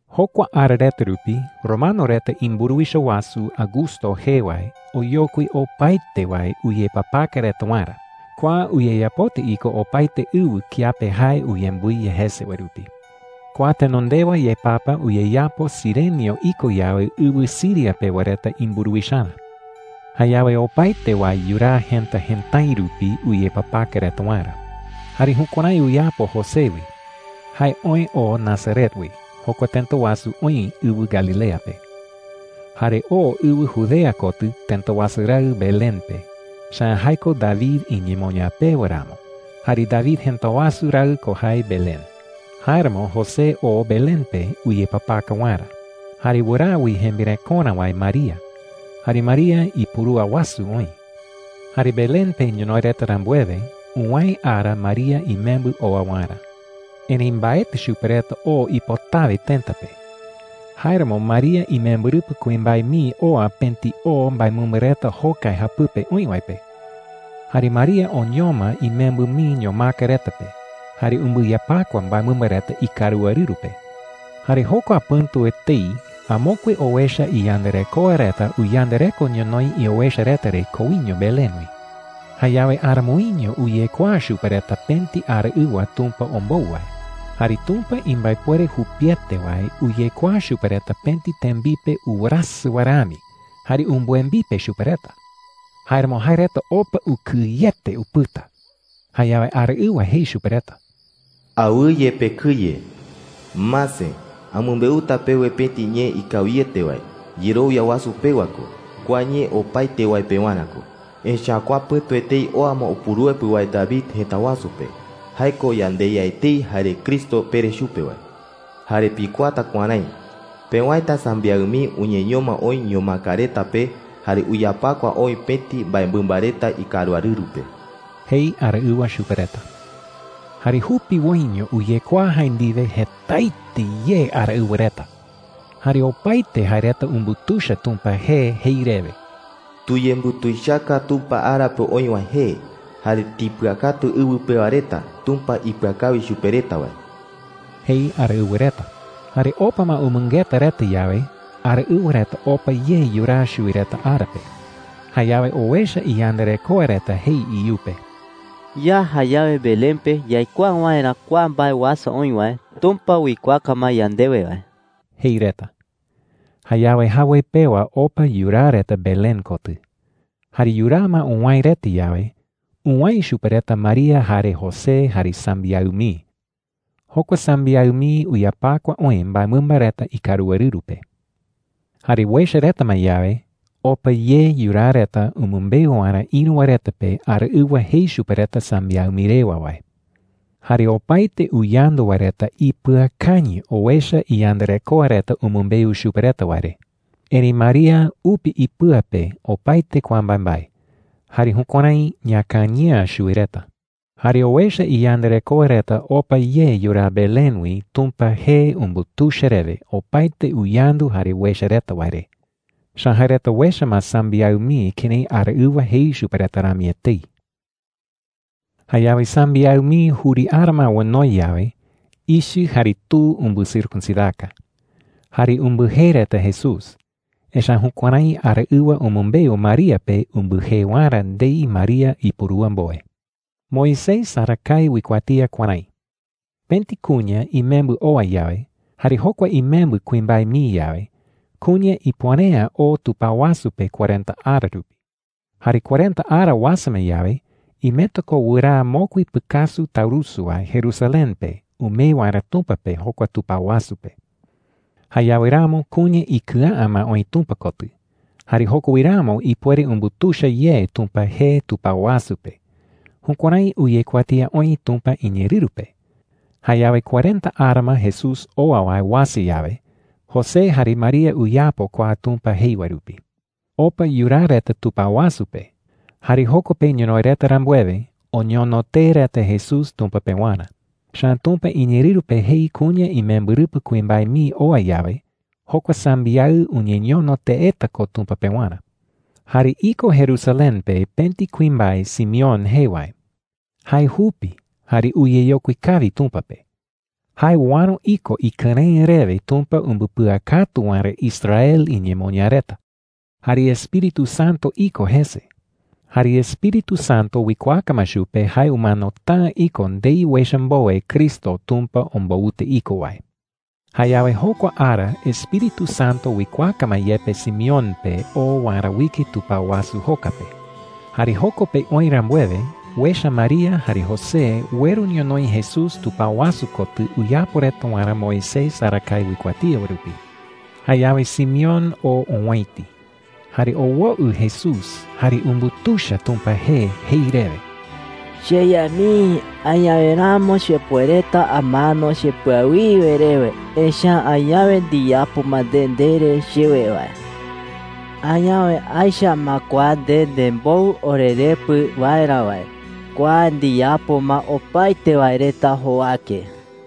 Jokua ara reta rupi romano reta imburuwicha wasu Augusto jee wae oyokui opaete wae uyepapaka reta waerä. Kua uyeyapota iko opaete ɨwɨ kiape jae uyembɨiya jese wae rupi. Kua tenondewa yepapa uyeyapo Cirenio iko yawe ɨwɨ Siria pewa reta imburuwicharä. Jayawe opaete wae yuraa jëta jëtái rupi uyepapaka reta waerä. Jare jukuärái uyapo José wi. Jae oë oo Nazaret wi – jokua tëta wasu oï ɨwɨ Galilea pe. Jare oo ɨwɨ Judea kotɨ tëta wasu raɨ Belén pe, echa’ä jae ko David iñemoñaa pewa ramo, jare David jëta wasu raɨ ko jae Belén. Jáeramo José oo Belén pe uyepapaka waerä, jare wɨraa wi jembirekorä wae María. Jare María ipurúa wasu oï. Jare Belén pe ñonoï reta rambuewe, uwäe ara María imembɨ oa waerä. Erëi mbaetɨ chupe reta o ipotawe tëta pe. Jáeramo María imembɨrɨpɨ kuimbae mii oa pëti o mbaemɨmba reta jokai japɨpe oï wae pe. Jare María oñoma imembɨ mii ñomaka reta pe jare umbɨyapakua mbaemɨmba reta ikaruarɨru pe. Jare jokua pɨ̈tu etei amokue owecha iyandarekoa reta uyandareko ñonoï iowecha reta re koiño Belén wi. Jayawe aramoiño uyekuaa chupe reta pëti araɨwa Tumpa ombou wae. Jare Tumpa imbaepuere jupiete wae uyekuaa chupe reta pëti tembipe uwerasɨ wae rami jare umbɨembipe chupe reta. Jáeramo jae reta opa ukɨyete upɨta. Jayawe araɨwa jei chupe reta: “Awɨye pekɨye,” jei. “Mase, amɨmbeuta pewe pëti ñee ikawiete wae, yerowia wasu pewa ko. Kua ñee opaete wae pewarä ko. Echa’ä kua pɨ̈tu etei oa ma Upuruepɨ wae David jëta wasu pe. Jae ko yandeYa etei jare Cristo pere chupe wae,” jei. “Jare pikuaata kuärái: pewäeta sambiaɨ mii uñeñoma oï ñomaka reta pe jare uyapakua oï pëti mbaemɨmba reta ikaruarɨru pe,” jei araɨwa chupe reta. Jare jupiwoiño uyekuaa jae ndiwe jetaete ye araɨwa reta. Jare opaete jae reta umbutuicha Tumpa jee jei rewe: “¡Tuyembutuichaka Tumpa ara pe oï wae jee! Jare tipɨakatu ɨwɨ pewa reta Tumpa ipɨakawi chupe reta wae,” jei araɨwa reta. Jare opa ma umɨngeta reta yawe, araɨwa reta opa ye yuraa chuwi reta ara pe. Jayawe owecha iyandarekoa reta jei iyupe: “Ya jayawe Belén pe yaikuaa waerä kua mbae uasa oï wae, Tumpa uikuaaka ma yandewe wae,” jei reta. Jayawe jawoi pewa opa yuraa reta Belén kotɨ. Jare yuraa ma uwäe reta yawe, uwäe chupe reta María jare José, jare sambiaɨ mii. Jokua sambiaɨ mii uyapakua oï mbaemɨmba reta ikaruarɨru pe. Jare uecha reta ma yawe, opa ye yuraa reta umɨmbeu waerä ïru wae reta pe araɨwa jei chupe reta sambiaɨ mii rewa wae. Jare opaete uyandu wae reta ipɨakañɨ owecha iyandarekoa reta umɨmbeu chupe reta wae re. Erëi María upi ipɨa pe opaete kua mbaembae jare jukuärái iñakañɨ'ä chuwi reta. Jare owecha iyandarekoa reta opa ye yuraa Belén wi Tumpa jee umbutuicha rewe opaete uyandu jare uecha reta wae re. Echa’ä jae reta uecha ma sambiaɨ mii kërái araɨwa jei chupe reta rami etei. Jayawe sambiaɨ mii juri ara ma onoi yawe, ichɨ jare tu umbɨcircuncidaka. Jare umbɨjee reta Jesús, echa’ä jukuärái araɨwa umɨmbeu María pe umbɨjee waerä ndei María ipurúa mbowe. Moisés arakae uikuatía kuärái: Pëti kuña imembɨ oa yawe, jare jokua imembɨ kuimbae mii yawe, kuña ipuere’ä oo tupao wasu pe cuarenta ara rupi. Jare cuarenta ara uasa ma yawe, imeta ko wɨraa mokui pɨkasu taurusu wae Jerusalén pe umee waerä Tumpa pe jokua tupao wasu pe. Jayawe ramo kuña ikɨa’ä ma oï Tumpa kotɨ, jare joko wi ramo ipuere umbutuicha ye Tumpa jee tupao wasu pe. Jukuärái uyekuatía oï Tumpa iñeerɨru pe. Jayawe cuarenta ara ma Jesús oa wae uasa yawe, José jare María uyapo kua Tumpa jei wae rupi. Opa yuraa reta tupao wasu pe. Jare joko pe ñonoï reta rambuewe, oñono tee reta Jesús Tumpa pewarä. Echa’ä Tumpa iñeerɨru pe jei kuña imembɨrɨpɨ kuimbae mii oa yawe, jokua sambiaɨ uñeñono teeta ko Tumpa pewarä. Jare iko Jerusalén pe pëti kuimbae Simeón jee wae. Jae jupi jare uyeyokui kawi Tumpa pe. Jae uäro iko ikɨrëɨ rewe Tumpa umbɨpɨakatu waerä Israel iñemoñaa reta. Jare Espíritu Santo iko jese. Jare Espíritu Santo uikuaaka ma chupe jae umanota’ä iko ndei uecha mbowe Cristo Tumpa ombouta iko wae. Jayawe jokua ara Espíritu Santo uikuaaka ma yepe Simeón pe oo waerä uike tupao wasu joka pe. Jare joko pe oï rambuewe, uecha María jare José ueru ñonoï Jesús tupao wasu kotɨ uyapo reta waerä Moisés arakae uikuatía wae rupi. Jayawe Simeón oo owäiti. Jare owoɨ Jesús jare umbutuicha Tumpa jee jei rewe: “CheYa mii, añawe ramo chepuereta amano chepɨawiwe rewe. Echa’ä añawe ndiyapo ma nde ndere chewe wae. Añawe aecha ma kua nde nembou orerepɨ waerä wae. Kua ndiyapo ma opaete wae reta jowake.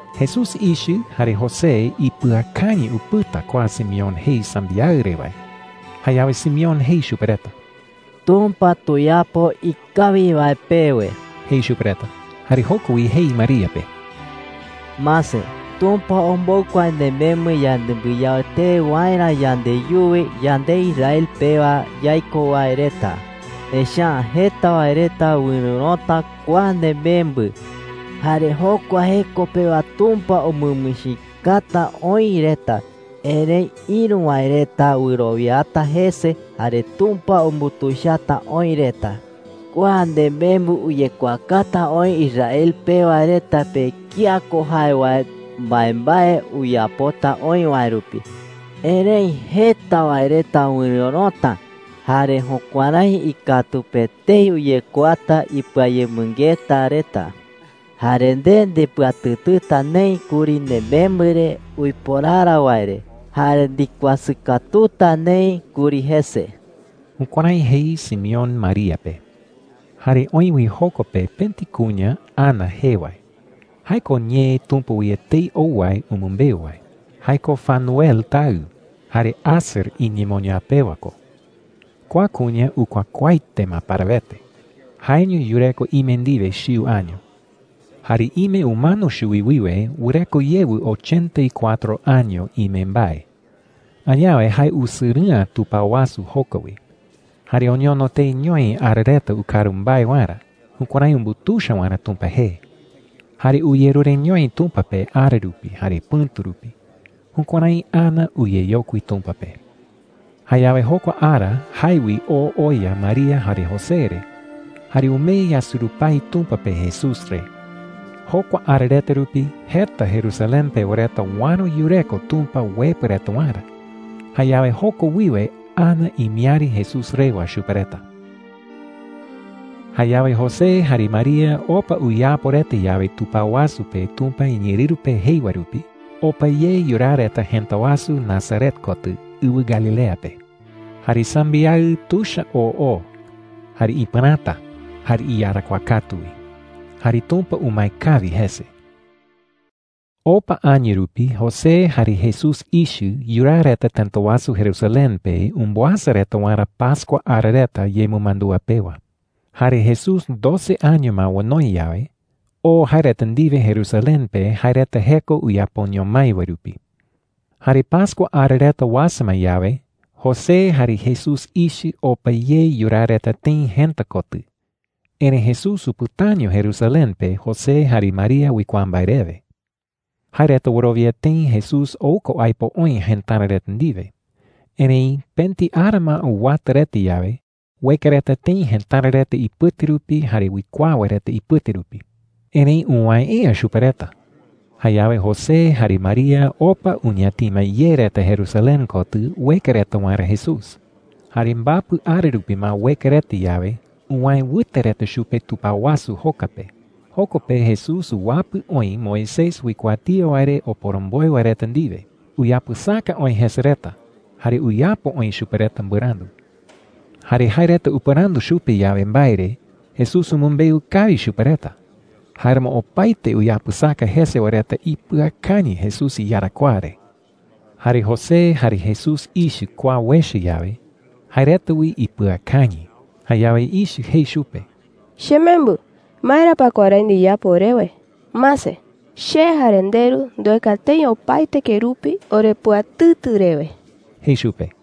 Jesús ichɨ jare José ipɨakañɨ upɨta kua Simeón jei sambiaɨ re wae. Jayawe Simeón jei chupe reta: “Tumpa tuyapo ikawi wae pewe,” jei chupe reta. Jare joko wi jei María pe: “Mase, Tumpa ombou kua nemembɨ yanembɨyao tee waerä yandeyuwi, yande Israel pewa yaiko wae reta. Echa’ä jeta wae reta wɨrɨ̈rota kua nemembɨ, jare jokua jeko pewa Tumpa umɨmichikata oï reta. Erëi ïru wae reta wɨrowiata jese, jare Tumpa umbutuichata oï reta,” jei. “Kua nemembɨ uyekuaakata oï Israel pewa reta pe kía ko jae wae mbaembae uyapota oï wae rupi. Erëi jeta wae reta wɨrɨ̈rota, jare jukuärái ikatu pe etei uyekuaata ipɨayemɨngeta reta. Jare nde ndepɨatɨtɨta neï kuri nemembɨ re uiporara wae re, jare ndikuasɨ katuta neï kuri jese.” Jukuärái jei Simeón María pe. Jare oï wi joko pe pëti kuña Ana jee wae. Jae ko ñee Tumpa wi etei ou wae umɨmbeu wae. Jae ko Fanuel tayɨ, jare Aser iñemoñaa pewa ko. Kua kuña ukuakuaaete ma parawete. Jaeño yureko ime ndiwe chiu año. Jare ime umano chuwi wiwe wɨreko yewɨ ochenta y cuatro año ime mbae. Añawe jae usɨrɨ'ä tupao wasu joka wi. Jare oñono teeñoi ara reta ukaru mbae waerä, jukuärái umbutuicha waerä Tumpa jee. Jare uyerureñoi Tumpa pe ara rupi jare pɨ̈tu rupi. Jukuärái Ana uyeyokui Tumpa pe. Jayawe jokua ara jae wi oo oya María jare José re. Jare umee yasurupái Tumpa pe Jesús re. Jokua ara reta rupi jeta Jerusalén pewa reta uäro yureko Tumpa uepɨ reta waerä. Jayawe joko wiwe Ana imiäri Jesús rewa chupe reta. Jayawe José jare María opa uyapo reta yawe tupao wasu pe Tumpa iñeerɨru pe jei wae rupi, opa ye yuraa reta jëta wasu Nazaret kotɨ ɨwɨ Galilea pe. Jare sambiaɨ tuicha oo oo, jare ipɨräta, jare iyarakuaa katu wi. Jare Tumpa umae kawi jese. Opa año rupi José jare Jesús ichɨ yuraa reta tëta wasu Jerusalén pe umbɨasa reta waerä pascua ara reta yemɨmandúa pewa. Jare Jesús doce año ma onoi yawe, oo jae reta ndiwe Jerusalén pe jae reta jeko uyapoño mái wae rupi. Jare pascua ara reta uasa ma yawe, José jare Jesús ichɨ opa ye yuraa reta tëi jëta kotɨ. Erëi Jesús upɨtaño Jerusalén pe José jare María uikuaa mbae rewe. Jae reta wɨrowia tëi Jesús ou ko aipo oï jëtara reta ndiwe. Erëi pëti ara ma uwata reta yawe, ueka reta tëi jëtara reta ipɨte rupi jare uikuaa wae reta ipɨte rupi. Erëi uwäe’ä chupe reta. Jayawe José jare María opa uñatima ye reta Jerusalén kotɨ ueka reta waerä Jesús. Jare mbapɨ ara rupi ma ueka reta yawe, uwäe wɨte reta chupe tupao wasu joka pe. Joko pe Jesús uwapɨ oï Moisés uikuatía wae re oporomboe wae reta ndiwe. Uyapɨsaka oï jese reta, jare uyapo oï chupe reta mbɨrandu. Jare jae reta upɨrandu chupe yawe mbae re, Jesús umɨmbeu kawi chupe reta. Jáeramo opaete uyapɨsaka jese wae reta ipɨakañɨ Jesús iyarakuaa re. Jare José jare Jesús ichɨ kua uecha yawe, jae reta wi ipɨakañɨ. Jayawe ichɨ jei chupe: “Chemembɨ, ¿maera pa kuärái ndiyapo orewe? Mase, che jare nderu ndueka tëi opaete kerupi orepɨatɨtɨ rewe,” jei chupe.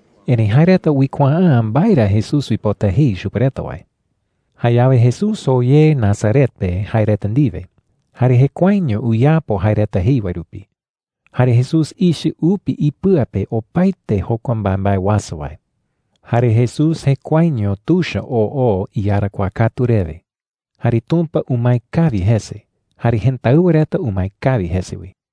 Erëi jae reta uikuaa’ä mbae ra Jesús uipota jei chupe reta wae. Jayawe Jesús oo ye Nazaret pe jae reta ndiwe, jare jekuaeño uyapo jae reta jei wae rupi. Jare Jesús ichɨ upi ipɨa pe opaete jokua mbaembae uasa wae. Jare Jesús jekuaeño tuicha oo oo iyarakuaa katu rewe. Jare Tumpa umae kawi jese, jare jëtáɨwa reta umae kawi jese wi.